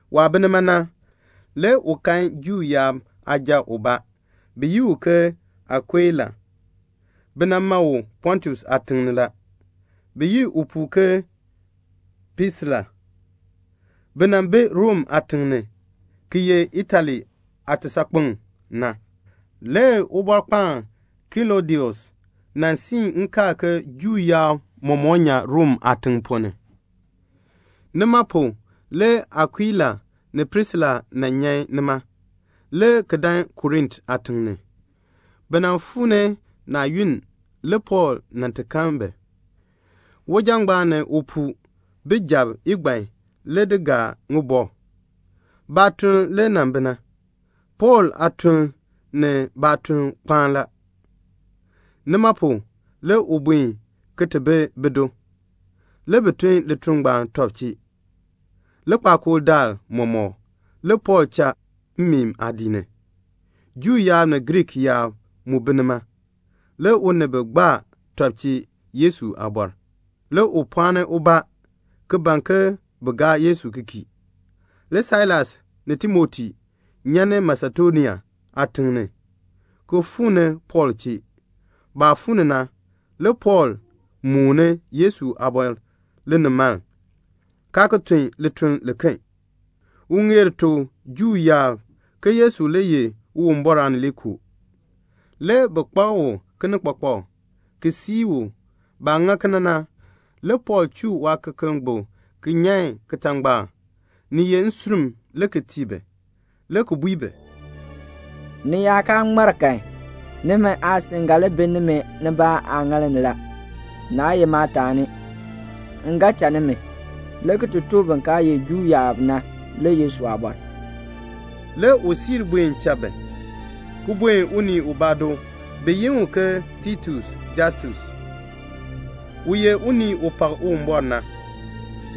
Waah bi nima na, le u kan Juu yaab aaja ubaa, bi yi u ke Akuila. Bi nan ma u Pontus aatiŋ ni la. Bi yi upuu ke Prisila. Bi nan bi Rom aatiŋ ni, ki ye Itali aatisaakpeŋ na. Le Ubɔrkpaan Klɔdius nan siin nkaal ke Juu yaab mɔmɔk nyan Rom aatiŋ ponn ni. Nima pu le Akuila ni Prisila nan nyan nima, le ki dan Korint aatiŋ ni. Bi nan fuu ni naa yunn le Pɔɔl nan ti kan bi. Uja ngbaan ni upuu, bi jab igban le di gaa ŋibɔk. Baatuln le nan bi na. Pɔɔl aatuln ni baatuln kpaa la. Nima pu le u buen ki ti bi bido. Le bi tun lituln ngbaan tɔb chee. Likpakool daal mɔmɔk le Pɔɔl cha mmeen aadiik ni. Juu yaab ni Griik yaab mu bi nima. Le u ni bi gbaa tɔb chee Yesu aabɔr. Le u pɔɔni ubaa ki ban ke bin gaa Yesu ki kii. Le Sailas ni Timoti nyan ni Masedonia aatim ni, ki fuu ni Pɔɔl chee. Baah fuu ni na, le Pɔɔl mooni Yesu aabɔr linimaln, kaa ki tun lituln liken. U ŋeer tuk Juu yaab ke Yesu le ye Uwumbɔr Aanileekoo. Le bi kpak u kinikpakpak, ki sii u. Baah ŋa kena na, le Pɔɔl chuu waakekeln gbuk ki nyan kitangbaak, ni ye nsurm le ki tii bi, le ki bui bi, "Ni yaa kaa ŋmar kan, nimi aasin ga li bi nimi nibaa aaŋaal ni la, naa ye maataani. M ga cha nimi, le ki tuk bin kaa ye Juu yaab na le Yesu aabɔr." Le u siir buen cha bi, ki buen unii ubaa do, bi yi u ke Titius Justus, u ye unii u pak Uwumbɔr na.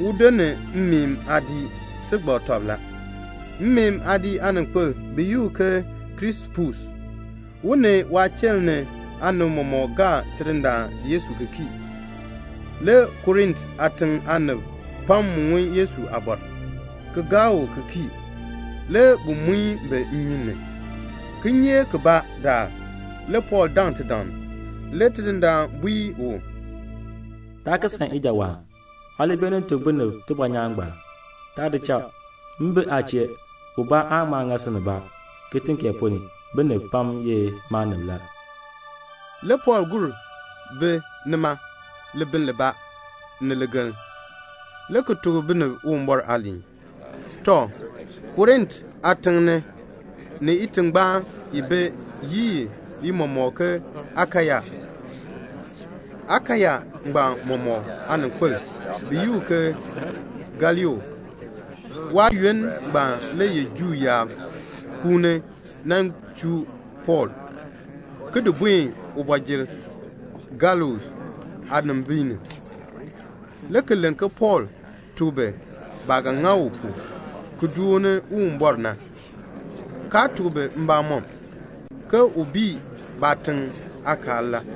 Udo ni mmeen aadiik si gbak tɔb la. Mmeen aadiik aaninkpil bi yi u ke Krispus, u ni waachiln ni aanib mɔmɔk gaa Tidindaan Yesu ki kii. Le Korint aatiŋ aanib pam mu ŋun Yesu aabɔr, ki gaa u ki kii. Le bi di bi ki muin bi nnyun ni. Kinyeek kibaa daal le Pɔɔl daŋ tidaŋ, le Tidindaan bui u, "Taa ki san ijawaan. Aa li beenin tuk binib tibɔnyaan ngbaan. Taa di cha. M bi aa chee. Ubaa aan ŋma ŋa si nibaa. Kitiŋ kee ponn ni, binib pam ye maanib la." Le Pɔɔl gur bi nima libiln libaa ni ligeln, le ki tuk binib Uwumbɔr aaliin. Tɔ, Korint aatiŋ ni itingbaan bi yi ni mɔmɔk ke Akaya. Akaya ngbaan mɔmɔk aaninkpil, bi yi u ke Galio. Waayoonn ngbaan le Juu yaab kuuni nan chuu Pɔɔl, ki di buen kooti ni, Galio aanimbiin ni, ki len ke Pɔɔl tuk bi baah ga ŋa pu ki dooni Uwumbɔr na, kaa tuk bi mbamɔm, ke u bii baatiŋ aakaal la.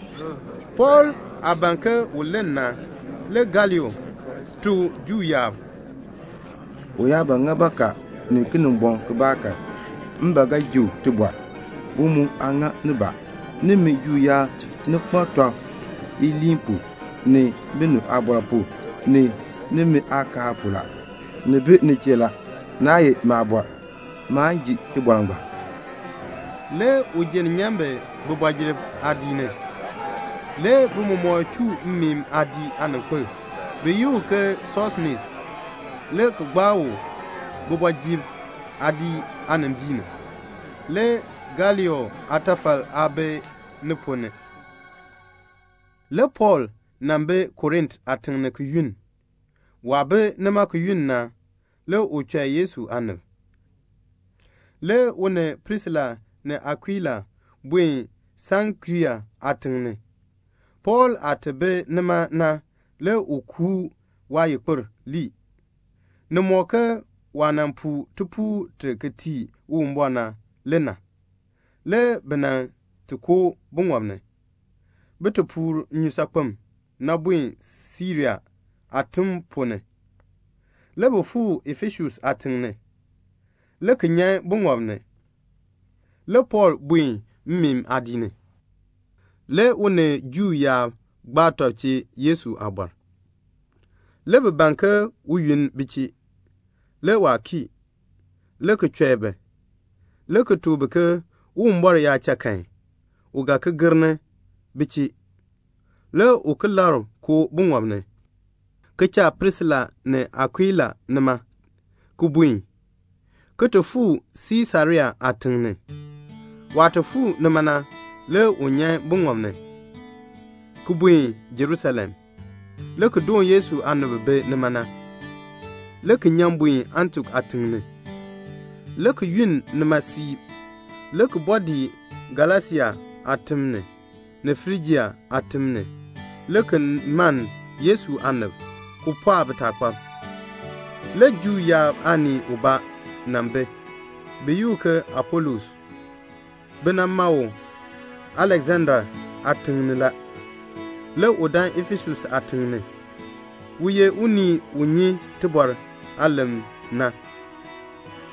Le Pɔɔl aah ban ke u len na, le Galio tuk Juu yaab, "U yaa ba ŋa bakaa ni kinimbɔŋ kibaa kan, m ba ga ji u tibɔr. U mu aa ŋa nibaa. Nimi Juu yaab, ni kpak tɔb iliin pu, ni binib aabɔr pu, ni nimi aakaal pu la. Ni bi ni chee la. Naa ye maabɔr. Maan ji tibɔr ngbaan." Le u jenn nyan bi kooti ni. Le bi mɔmɔk chuu mmeen aadiik aaninkpil, bi yi u ke Sosenes, le ki gbaa u kooti aadiik aanimbiin ni. Le Galio aatafal aa bi ni ponn ni. Le Pɔɔl nan bi Korint aatiŋ ni ki yunn. Waah bi nima ki yunn na, le u chɔi Yesu aanib. Le u ni Prisila ni Akuila buen Seŋkrea aatiŋ ni. Pɔɔl aah ti bi nima na le u kuu waayikpir lii. Ni mɔk ke waah nan puu tipuul ti ki tii Uwumbɔr na le na. Le bi nan ti koo buŋɔb ni, bin ti puur nnyusaakpem na buen Siria aatim ponn ni. Le bi fuu Efesus aatiŋ ni, le ki nyan buŋɔb na ni. Le Pɔɔl buen mmeen aadiik ni. Le u ni Juu yaab gbaa tɔb chee Yesu aabɔr. Le bi ban ke u yunn bi chee. Le waa kii, le ki chɔi bi, le ki tuk bi ke Uwumbɔr yaa cha kan, u ga ki gir ni bi chee. Le u ki labr koo buŋɔb ni, ki cha Prisila ni Akuila nima, ki buen, ki ti fuu Siisarea aatiŋ ni. Waah ti fuu nima na le u nyan buŋɔb na ni, ki buen Jerusalem, le ki doon Yesu aanib bi bi nima na, le ki nyan buen Antiok aatiŋ ni, le ki yunn nima siib, le ki bɔɔ dii Galasia aatim ni, ni Frijia aatim ni, le ki mann Yesu aanib, ki pɔɔk bitaakpab. Le Juu yaab aanii ubaa nan bi, bi yi u ke Apolos. Bi nan ma u Aleksandria aatiŋ ni la. Le u dan Efesus aatiŋ ni. U ye unii u nyi tibɔr aalem na,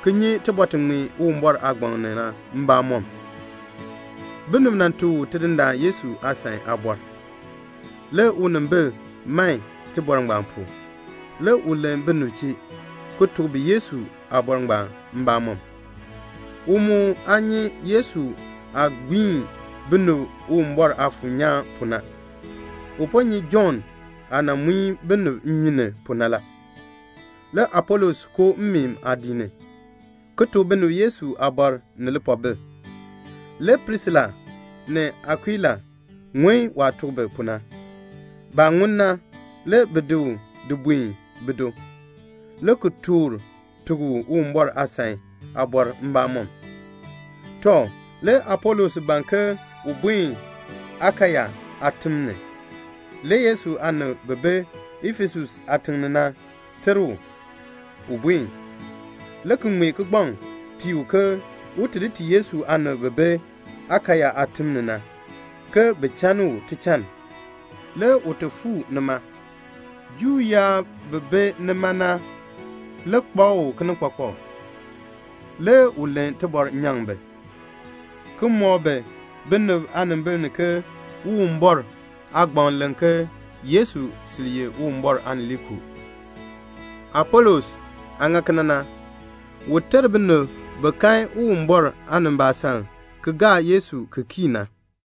ki nyi tibɔr ti ŋmee Uwumbɔr aagbaŋ ni na mbamɔm. Binib nan tuk u Tidindaan Yesu aasan aabɔr. Le unimbil man tibɔr ngbaan pu. Le u len binib chee, ki tuk bi Yesu aabɔr ngbaan mbamɔm. U mu aa nyi Yesu aah gbiin binib Uwumbɔr Aafuur nyaan ni pu na. U po nyi Jɔnn aah nan muin bi nnyun ni pu na la. Le Apolos koo mmeen aadiik ni, ki tuk binib Yesu aabɔr ni lipoobil. Le Prisila ni Akuila ŋun waah tuk bi pu na. Baah ŋun na, le bi di u di buen bido, le ki toor tuk u Uwumbɔr aasan aabɔr mbamɔm. Tɔ, le Apolos ban ke un buen Akaya aatim ni. Le Yesu aanib bi bi Efesus aatiŋ ni na ter u, un buen, le ki ŋmee kigbaŋ tii u ke un ti tii Yesu aanib bi bi Akaya aatim ni na, ke bin chann u tichann. Le u ti fuu nima. Juu yaab bi bi nima na le kpak u kinikpakpak. Le u len tibɔr nyaŋ bi, ki mɔk bi binib aanimbil ni ke Uwumbɔr aagbaŋ len ke Yesu sil ye Uwumbɔr Aanileekoo. Apolos aah ŋa kena na, u ter binib bi kan Uwumbɔr aanimbaasaln aan ki gaa Yesu ki kii na.